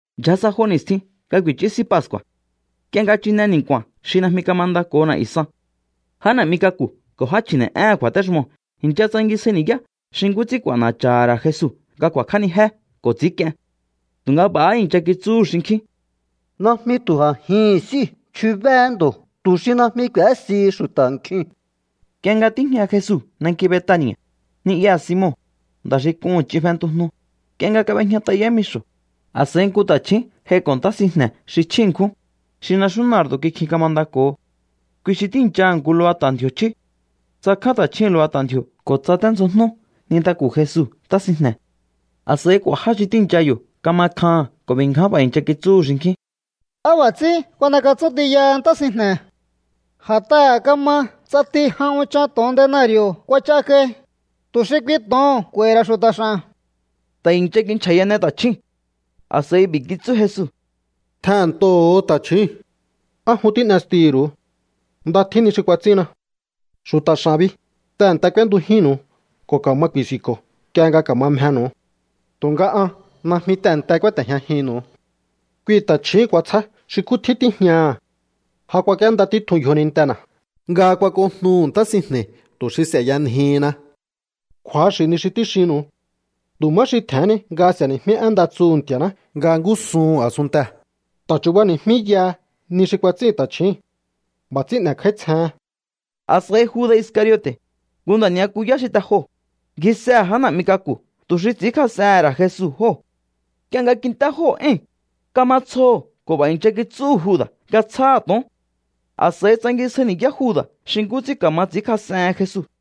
Ndyja sa jo ni̱stjin nga ku̱i̱chú S'í Pascu̱a̱, nk'ie nga chine ni̱nku̱a̱n xi najmi kamandako̱ho na̱'yu̱ san. Já na̱'mi k'aku̱ ko̱ já chji̱ne̱'éhe̱n kju̱a̱téxumoo̱ i̱ncha tsangisjai ni̱yá xi nkú ts'ín k'u̱a̱na̱cha̱ha̱ ra̱ Jesu nga ku̱a̱kj'ánijé ko̱ ts'i̱ínk'ien. Tu̱nga b'a̱há i̱ncha kitsúhu̱ xinkjín: —Najmi tu̱ a̱jihi̱n s'íu̱ chjubéé ndo̱ tu̱ xi najmi k'u̱ésihi xu̱ta̱ nkjiu̱n. Nk'ie nga tíjña Jesu nanki Betani̱a̱, ni'yaha̱ Simon, nda̱ xi k'uhu̱n ch'in fentujnu, nk'ie nga kab'ejñat'a yámixo̱, a̱s'a̱i nku ta̱chju̱ún j'aiko̱ ntá sinjne̱ xi chjí ṉkjún, xi naxú nardo̱ kikjin kamandako̱ho. Kui xi tíi̱nchaha̱ nku lubata̱ ndji̱o̱ chjí. Tsakján ta̱chjúu̱n lubata̱ ndji̱o̱ ko̱ tsaténdzjojnú nintaku̱ Jesu ntá sinjne̱. A̱s'a̱i k'u̱a̱ já xi tíi̱ncha yo̱ kama kjaha̱n ko̱ b'i̱ ngján b'a̱ i̱ncha kitsúhu̱ xinkjín: —¿Á b'a̱ ts'ín kuan'ekatsún tiyaha ntá sinjne̱? A̱t'aha̱ kama ts'ati jan unchan to̱on denari̱o̱ kuach'a kai, tu̱ xi kui to̱oo̱n k'u̱a̱i̱hi̱ ra̱ xu̱ta̱ x'a̱n. Ta̱ i̱ncha kinchja̱yane ta̱chjúu̱n. A̱s'a̱i b'i̱ kitsú Jesu: —Tjehe̱nntoho̱o ta̱chjúu̱n. ¿Á jun tín'estihi̱ru̱u? Nda tjín ni xi kuats'ínna. Xu̱ta̱ x'a̱n bi, tehe̱nte k'úéntujínnu̱u ko̱ ka̱ma ku̱i̱si̱nko̱o nk'ie nga ka̱ma mjenu̱u. Tu̱nga an najmi tehe̱nte kúáte̱jñajinnu̱u. Kui ta̱chjíi̱n kuatsjá xi nkú tjín tíjñaha̱. Ja kuak'íénda títjun yjonintena̱ nga kuak'ojnuhu̱ ntá sinjne̱i̱ tu̱ xi s'e̱yanjihinna. Kju̱axi̱ ni xi tíxinnu̱u. Tu̱ má xi tje̱hén ni nga s'e̱ni̱jmí én nda tsuhu̱ Nti̱a̱ná nga ngúsuhu̱n a̱sunntee̱, ta̱ chu̱bani̱jmíyaha ni xi kuats'ín ta̱chjíi̱n. B'a̱ ts'ín n'e̱kj'áítsjehen. A̱s'a̱i Juda̱ Iscariote̱, nku nda̱ ni'yakuyá xi te joo̱, ngjisehe̱ já na̱'mi k'aku̱ tu̱ xi ts'i̱ínkjas'ehe̱n ra̱ Jesu jóo̱. Nk'ie nga kint'é jóo̱ éi̱n, kama tsjoho̱ ko̱ b'a̱ i̱ncha kitsúhu̱ Juda̱ nga tsjáha̱ to̱on. A̱s'a̱i tsangisjai ni̱yá Juda̱ xi nkú ts'ín ka̱ma ts'i̱ínkjas'ehen Jesu.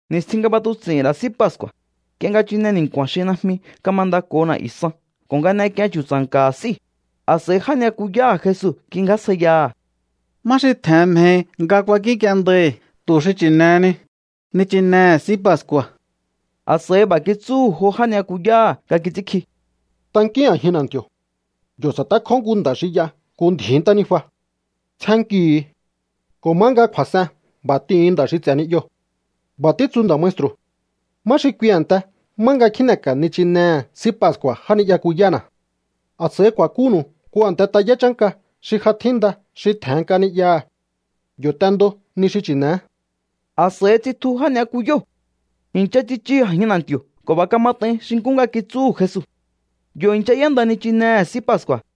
Ni̱stjin nga b'atuts'i̱hi̱n ra̱ S'í Pascu̱a̱, nk'ie nga chine ni̱nku̱a̱n xi najmi kamandako̱ho na̱'yu̱ san ko̱ nga n'ek'ien chu̱tsa̱nka̱ha̱ s'íu̱, a̱s'a̱i já ni'yakuyáha̱ Jesu kingjásjaiyaha̱: —¿Má xi tje̱hen mjehi nga kuankínk'iendai̱ tu̱ xi chi̱ne̱heni nichinehe̱ S'í Pascu̱a̱? A̱s'a̱i b'a̱ kitsúhu̱ jo já ni'yakuyáha̱ nga kits'ínkji: —Tankíún a̱jin na̱nti̱o̱. Yo̱ sa̱tékjó nku nda̱ xi y'a nku ndji̱í ntánijua. Tsjénnkihu̱u ko̱ má nga kju̱a̱s'en b'a̱ t'ihu̱un nda̱ xi ts'e̱ ni'yoo̱: “B'a̱ títsu nda̱ maestru̱: ¿Má xi kui a̱nte má nga kjíne̱ka̱ nichinehe̱ S'í Pascu̱a̱ já ni'yakuyána̱?” A̱s'a̱i ku̱a̱kúnu̱u nku a̱nte tayá chánka xi ja tjínda xi tje̱hen nk'a ni'yaha̱. Yo̱ t'endo ni xi chi̱ne̱é. A̱s'a̱i tsitju já ni'yakuyóo̱. I̱ncha tsichu a̱jin na̱nti̱o̱ ko̱ b'a̱ kamat'ain xi nkú nga kitsúhu̱ Jesu. Yo̱ i̱ncha y'énda nichinehe̱ S'í Pascu̱a̱.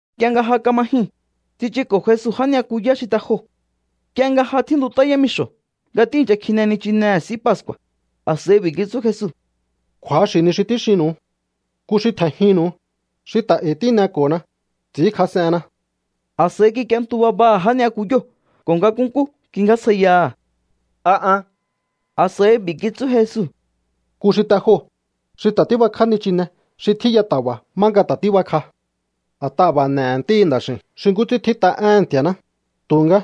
Nk'ie nga ja kama jyuu̱n, tsichuko̱ Jesu já ni'yakuyá xi te joo̱. Nk'ie nga ja tjíntut'á yámixo̱ nga tíi̱ncha kjine nichinehe̱ S'í Pascu̱a̱, a̱s'a̱i b'i̱ kitsú Jesu: —Kju̱axi̱ ni xi tíxinnu̱u. Nku xi tje̱njinnu̱u, xi ta̱ e̱i̱ tíneko̱na, ts'i̱ínkjas'enna. A̱s'a̱i kik'ientu babaha̱ já ni'yakuyóo̱ ko̱ nga nkúnkú kingjásjaiyaha̱: —¿A an? A̱s'a̱i b'i̱ kitsú Jesu: —Nku xi te joo̱, xi ta̱ tíbakj'á nichine xi tjíya ta̱ba̱ má nga tíbakj'a. A̱t'aha̱ b'a̱ n'e̱he̱ Ntíhi̱ Nda̱x'i̱u̱n xi nkú ts'ín tjít'a éhe̱n Nti̱a̱ná, tu̱nga,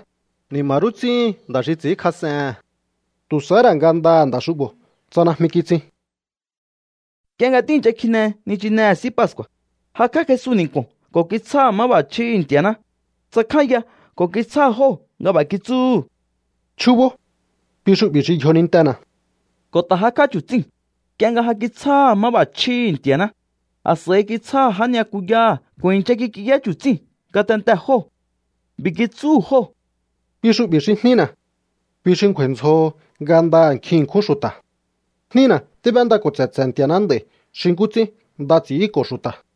¡ni̱ma̱ rú ts'íhin nda̱ xi ts'i̱ínkjas'ehe̱n! Tu̱ sahá ra̱ ngandaha̱ nda̱ xu'bo̱ tsa najmi kitsin. Nk'ie nga tíi̱ncha kjine nichinehe̱ S'í Pascu̱a̱, jakj'á Jesu ni̱nku̱o̱n ko̱ kitsjáha̱ máb'a̱chjíhi̱ Nti̱a̱ná. Tsakjánya ko̱ kitsjáha̱ jóo̱ nga b'a̱ kitsúhu̱: —Chjúbó. Kui xu'bi̱ xi yjonintena̱. Ko̱ ta̱ jakj'á chu̱tsíu̱n. Nk'ie nga ja kitsjáha̱ máb'a̱chjíhi̱ Nti̱a̱ná, a̱s'a̱i kitsjáha̱ já ni'yakuyáha̱ ko̱ i̱ncha kik'iyá chu̱tsíu̱n ngatentee̱ jóo̱. B'i̱ kitsúhu̱ jóo̱: —Kui xu'bi̱ xi jnína̱. Kui xi ngju̱a̱i̱ ndzjoho ngandaha̱ nkjin ṉkjún xu̱ta̱. Jnína tíb'éndako̱ tse̱tse̱ Nti̱a̱ná nd'a̱i̱ xi nkú ts'ín nda ts'i̱ínko̱ xu̱ta̱.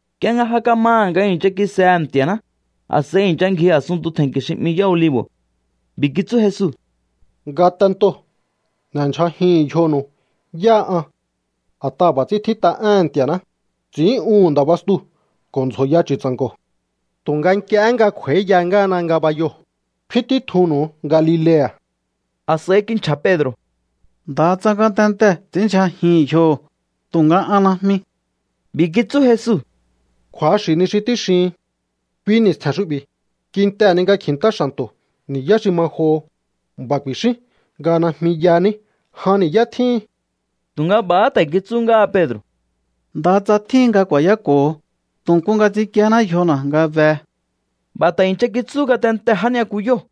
Nk'ie nga ja kamaha̱ nga i̱ncha kisehe̱ Nti̱a̱ná, a̱s'a̱i i̱ncha ngji a̱sunntu tje̱nnki̱ xi 'mi Yá Olivo̱. B'i̱ kitsú Jesu: —Ngatentoo̱ n'e̱ndyja̱jihu̱un yjonu̱u yáha an. A̱t'aha̱ b'a̱ ts'ín tjít'a éhe̱n Nti̱a̱ná: “Ts'in'úhu̱n nda̱ bastuu̱ ko̱ ndzjo̱ya chu̱tsa̱nko̱.” Tu̱nga nk'iehé nga kj'u̱a̱íya ngáhana ngabayoo̱, kfín títjunnu̱u Galilea̱. A̱s'a̱i kinchja̱ Pedro̱: —Ndaha tsa ngatentee̱ ts'i̱ínndyja̱jihi̱n yjoho̱, tu̱nga an najmi. B'i̱ kitsú Jesu: —Kju̱axi̱ ni xi tíxihin. Kui ni̱stje̱n xu'bi̱, kintehe̱ ni nga kji̱ntá xa̱nto̱ ni̱yá xi ma joho, b'a̱ ku̱i̱xín nga najmi yaní jan ni̱yá tjíhin. Tu̱nga b'a̱há ta̱ kitsú ngáha Pedro̱: —Ndaha tsa tjíhin nga ku̱a̱yáko̱ho, tu̱ nku nga ts'inkíéná yjona̱ nga behe. B'a̱ ta̱ i̱ncha kitsú ngatentee̱ já ni'yakuyóo̱.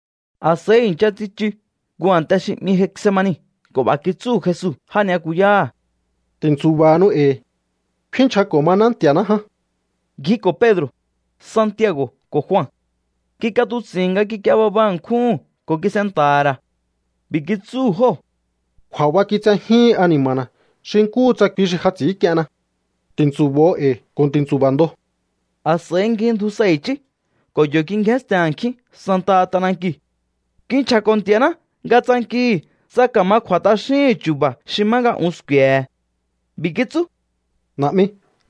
A̱s'a̱i i̱ncha tsichu nku a̱nte xi 'mi Getsemani ko̱ b'a̱ kitsúhu̱ Jesu já ni'yakuyáha̱: —Ti̱ntsu̱ba̱hanu e̱i̱. Kfínnchjako̱ maná Nti̱a̱ná ján. Ngjiko̱ Pedro̱, Santiago̱ ko̱ Jua. Kik'atuts'i̱hi̱n nga kik'ie baba ṉkjúhu̱n ko̱ kis'enta̱ha̱ ra̱. B'i̱ kitsúhu̱ jóo̱: —Kju̱a̱ba kitsejíhin ani̱ma̱na̱ xi nkúhu tsa kui xi ja ts'i̱ínk'ienna. Ti̱ntsu̱bo̱o e̱i̱ ko̱ ti̱ntsu̱ba̱ ndo. A̱s'a̱i ngjindju sa i̱chí ko̱ yo̱ kingjénsten a̱nkjín santaha t'anankiu̱. Kinchja̱ko̱ Nti̱a̱ná nga tsankihi̱ tsa ka̱ma kj'u̱a̱ t'axíhi̱n chu̱ba̱ xi má nga un sku̱e̱he̱. B'i̱ kitsú: —Na̱'mi,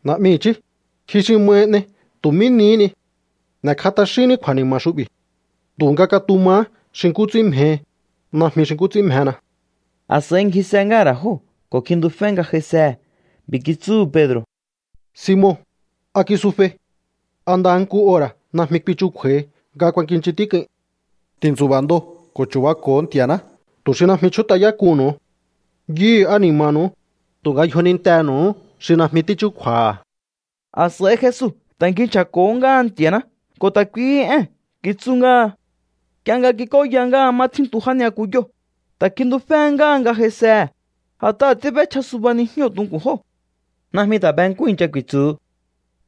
na̱'mi chí, ji xi mahi n'ei tu̱ mí nihí ni. N'e̱kj'a t'axínní kju̱a̱ni̱ma̱ xu'bi̱. Tu̱nga katumahá xi nkú ts'ín mjehi, najmi xi nkú ts'ín mjena. A̱s'a̱i ngjise ngáha̱ ra̱ jóo̱, ko̱ kjintufé nga j'aisehe̱. B'i̱ kitsúhu̱ Pedro̱: —Simon, ¿a kisufei? ¿A ndaha nku ora̱ najmi kuichukju̱a̱hi nga kuakinchin tík'uin? Ti̱ntsu̱ba̱ ndo ko̱ chu̱bako̱o Nti̱a̱ná tu̱ xi najmi chjút'ayák'uhu̱nnu̱u. Yuhu̱ ani̱ma̱nu̱u, tu̱nga yjonintenu̱uhú xi najmi tíchúkju̱a̱ha̱. A̱s'a̱i Jesu ta̱ ngji nchja̱ko̱hó ngáha Nti̱a̱ná ko̱ ta̱ kuihí ée̱n kitsú ngáha. Nk'ie nga kik'óya ngáha má tjíntu já ni'yakuyóo̱, ta̱ kjintuféhé ngáha nga j'aisehe̱, a̱t'aha̱ tíb'échja suba nijñóo̱ tunku̱n jóo̱. Najmi ta̱ be nkú i̱ncha ku̱i̱tsu̱hu.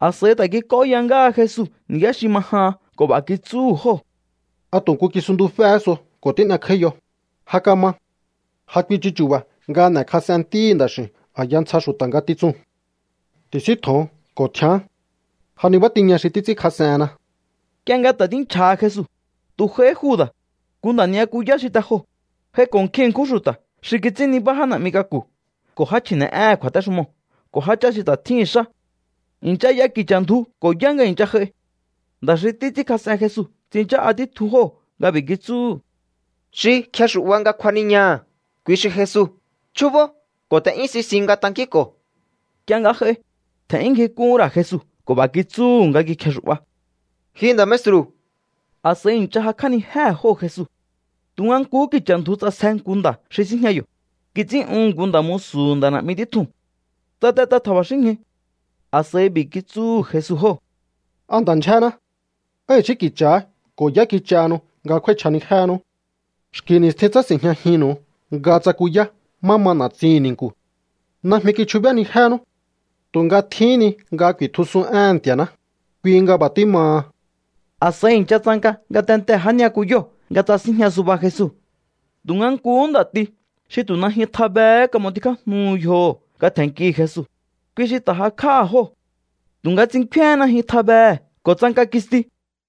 A̱s'a̱i ta̱ kik'óya ngáha Jesu ni̱yá xi ma jahan ko̱ b'a̱ kitsúhu̱ jóo̱: —¿A tu̱ nku kisuntuféhé so ko̱ tín'ekj'áíyo? Ja kama. Ja kuichu chu̱ba̱ nga n'e̱kjas'en Ntíhi̱ Nda̱x'i̱u̱n a̱ya ntsja xu̱ta̱ ngatitsuu̱n. Ti̱síntjo̱on ko̱ tjián. Ja nibá tiña xi títs'ínkjas'enna. Nk'ie nga ta̱ tínchja̱ha Jesu, tu̱ j'aihí Juda̱, nku nda̱ ni'yakuyá xi te joo̱. J'aiko̱ nkjin ṉkjún xu̱ta̱ xi kits'ín nibá já na̱'mi k'aku̱ ko̱ já chji̱ne̱'éhe̱n kju̱a̱téxumoo̱ ko̱ jáchá xi ta̱ tjíhi̱n xá. I̱ncha y'a ki̱cha̱ ndju ko̱ yá nga i̱ncha j'ai. Nda̱ xi títs'ínkjas'en Jesu tsinchá'a títjun jóo̱ nga b'i̱ kitsúhu̱: —Xi kjexu̱'ba nga kjuaniñaha̱, kui xi Jesu. Chjúbó ko̱ t'e'yún sisiun nga tankínko̱o. Nk'ie nga j'ai, tje̱n'yún ngjik'úhún ra̱ Jesu ko̱ b'a̱ kitsúhu̱ nga kikjexu̱'ba: —Ji nda̱ maestru̱. A̱s'a̱i i̱ncha jakj'ánijéhe̱ jóo̱ Jesu. Tu̱nga nkuhú ki̱cha̱ ndju ts'asje nku nda̱ xi síjña yo̱. Kits'ín'uhu̱n nku nda̱ musu̱hu̱ nda̱ na̱'mi títjuu̱n. Tsatet'a tja̱ba̱xínñju. A̱s'a̱i b'i̱ kitsúhu̱ Jesu jóo̱: —¿A nda̱ ndyjéná? ¿Á i̱xí ki̱cha̱há ko̱ yá kich'ahanu nga kjúái̱chj'anijéhenú? Xki̱ ni̱stjin tsási̱njñajinnu̱u nga tsakuyá má ma na̱tsihi̱n ni̱nku̱. Najmi kichjubénijénú. Tu̱nga tjíhín ni nga ku̱i̱tjusun éhe̱n Nti̱a̱ná, kui nga b'a̱ tímaha. A̱s'a̱i i̱ncha tsanka ngatentee̱ já ni'yakuyóo̱ nga tsasínjña suba Jesu. Tu̱nga nkuhú nda̱ti xi tu̱ najyun tjabehé kam'otikjájnuhu yjoho̱ nga tje̱nnkihi̱ Jesu, kui xi ta̱ jakj'áha̱ jóo̱. Tu̱nga tsinkféhén najyun tjabehe̱ ko̱ tsanka kisti.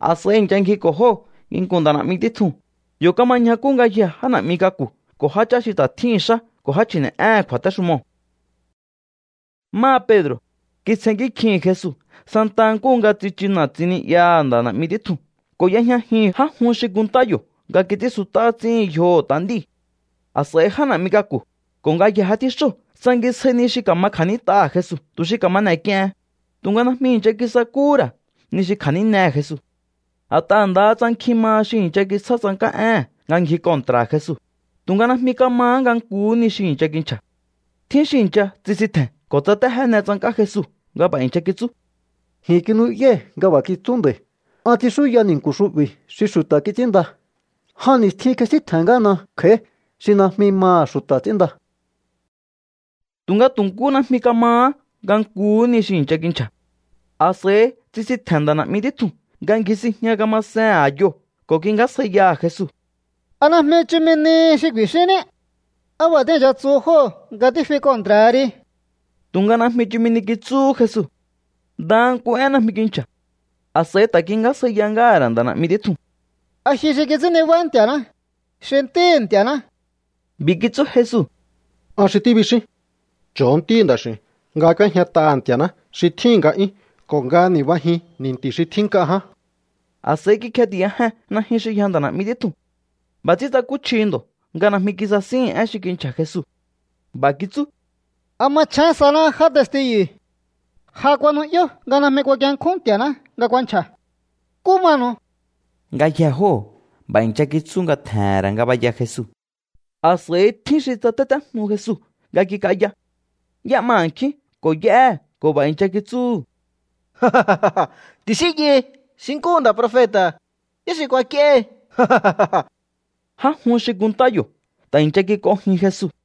A̱s'a̱i i̱ncha ngjiko̱ jóo̱ Jesu nginku̱n nda̱ na̱'mi títjuu̱n. Yo̱ kama ñjakú ngayjee̱ já na̱'mi k'aku̱ ko̱ jáchá xi ta̱ tjíhi̱n xá ko̱ já chji̱ne̱'éhe̱n kju̱a̱téxumoo̱. Máha Pedro̱, kitsjennkí kjihi̱n Jesu santa nkúhu nga tsichu na̱tsin ni'yaha̱ nda̱ na̱'mi títjuu̱n ko̱ y'ejñajihi̱n já jun xi kunntá yo̱ nga kits'ínsut'á ts'íhin yjoho̱ t'a nd'íu̱. A̱s'a̱i já na̱'mi k'aku̱ ko̱ ngayjee̱ já tjíxóo̱ tsangisjai ni xi ka̱ma kja̱nít'aha̱ Jesu tu̱ xi ka̱ma n'e̱k'iehen, tu̱nga najmi i̱ncha kisakúhú ra̱ ni xi kja̱nínehe̱ Jesu. A̱t'aha̱ ndaha tsa nkjin maha xi i̱ncha kitsjá tsank'á éhe̱n nga ngji kontra̱ha̱ Jesu, tu̱nga najmi kamahá nga nkuhú ni xi i̱ncha kinchja̱. Tjín xi i̱ncha tsisintje̱n ko̱ tsatéjéne tsank'á Jesu nga b'a̱ i̱ncha kitsú: —Ji̱n kinu'yái̱ nga b'a̱ kitsú nda̱i̱: “An ts'inxúya ni̱nku̱ xu'bi̱ xi xu̱ta̱ kits'ínnda. Jan ni̱stjin kjesíntje̱n ngáhana kj'a̱í xi najmi maha̱ xu̱ta̱ ts'ínnda.” Tu̱nga tu̱ nkú najmi kamahá nga nkuhú ni xi i̱ncha kinchja̱. A̱s'a̱i tsisintje̱n nda̱ na̱'mi títjuu̱n nga ngji sinjña kamasehe̱n a̱yoo̱ ko̱ kingjásjaiyaha̱ Jesu: —¿A najmi chumi nihi xi ku̱i̱xínní? ¿Á b'a̱ tíi̱ncha tsuhu jóo̱ nga tífi kontra̱ha ri? Tu̱nga najmi chumi ni kitsúhú Jesu. Ndaha nku én najmi kinchja̱. A̱s'a̱i ta̱ kingjásjaiyahá ngáha̱ ra̱ nda̱ na̱'mi títjuu̱n: —¿A ji xi kits'ín nibá Nti̱a̱ná, xi Ntíhi̱ Nti̱a̱ná? B'i̱ kitsú Jesu: —An xi tíbixín. Cho̱o Ntíhi̱ Nda̱x'i̱u̱n nga k'úéjñat'aha̱ Nti̱a̱ná xi tjíhi̱n nga'yún ko̱ nga ni̱bajin ni̱nti̱ xi tjín nk'a ján. A̱s'a̱i kikjeti̱yajen najyun xi yja nda̱ na̱'mi títjuu̱n. B'a̱ ts'ín tsakúchji ndo̱ nga najmi kisasíhi̱n én xi kinchja̱ Jesu. B'a̱ kitsú: —¿A machjén saná já testiyu̱? Ja kuanu'yó nga najmi kuakienkjún Nti̱a̱ná nga kuanchja̱. ¿Nkú manu̱u? Ngayjee̱ jóo̱ b'a̱ i̱ncha kitsú nga tje̱he̱n ra̱ ngabaya Jesu. A̱s'a̱i tjín xi tsatétéjnu Jesu nga kik'aya. Y'é'ma a̱nkjín ko̱ y'éhe̱ ko̱ b'a̱ i̱ncha kitsúhu̱: —Ti̱xínyai xi nkúhu nda̱ profeta̱, ¿yá xi kuak'íéhi? Já jun xi kunntá yo̱ ta̱ i̱ncha kik'onjin Jesu.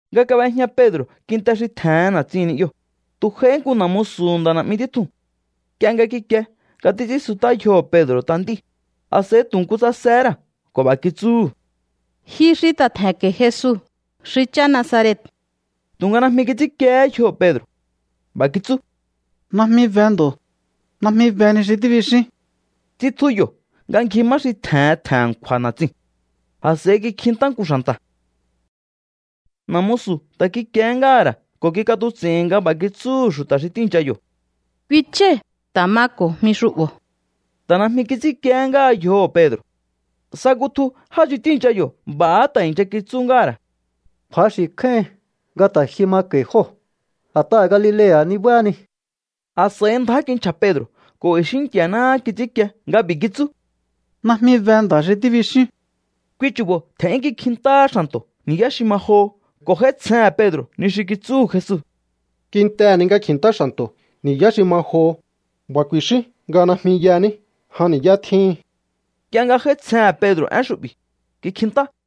Nga kab'ejña Pedro̱ kintee̱ xi tje̱hen na̱tsin ni'yoo̱, tu̱ j'aihí nku na̱ musu̱hu̱ nda̱ na̱'mi títjuu̱n. Nk'ie nga kikie nga títs'ínsut'á yjoho̱ Pedro̱ t'a nd'íu̱, a̱s'a̱i tu̱ nku tsasehé ra̱ ko̱ b'a̱ kitsúhu̱: —Ji xi ta̱ tje̱nko̱i̱ Jesu xi chá Nazaret. Tu̱nga najmi kits'ínkiehé yjoho̱ Pedro̱. B'a̱ kitsú: —Najmi be ndo̱. Najmi be ni xi tíbixín. Tsitju yo̱ nga ngji má xi tje̱hen tje̱n a̱nkju̱a̱ na̱tsiu̱n. A̱s'a̱i kikjintá nku xa̱nta̱. Na̱ musu̱ ta̱ kikiehé ngáha̱ ra̱ ko̱ kik'atuts'i̱hi̱n nga b'a̱ kitsúhu̱ xu̱ta̱ xi tíi̱ncha yo̱: —Kui chái̱ ta̱ mako̱ jmi xu'bo̱. Ta̱ najmi kits'ínkiehé ngáha yjoho̱ Pedro̱. Sa kutju já xi tíi̱ncha yo̱ b'a̱há ta̱ i̱ncha kitsú ngáha̱ ra̱: —Kju̱axi̱ kjáíhin nga ta̱ ji mako̱i̱ jóo̱. A̱t'aha̱ Galilea̱ nibáhani. A̱s'a̱i ndjá kinchja̱ Pedro̱ ko̱ i̱xí Nti̱a̱náhá kits'ínkie nga b'i̱ kitsú: —¡Najmi be nda̱ xi tíbixíún! Kui chu̱bo̱ tje̱n'yún kikjintáhá xa̱nto̱ ni̱yá xi ma joho ko̱ j'áítsjehe̱n Pedro̱ ni xi kitsúhu̱ Jesu: “Kintehe̱ ni nga kji̱ntá xa̱nto̱ ni̱yá xi ma joho, b'a̱ ku̱i̱xín nga najmi yaní jan ni̱yá tjíhin.” Nk'ie nga j'áítsjehe̱n Pedro̱ én xu'bi̱, kikjintá.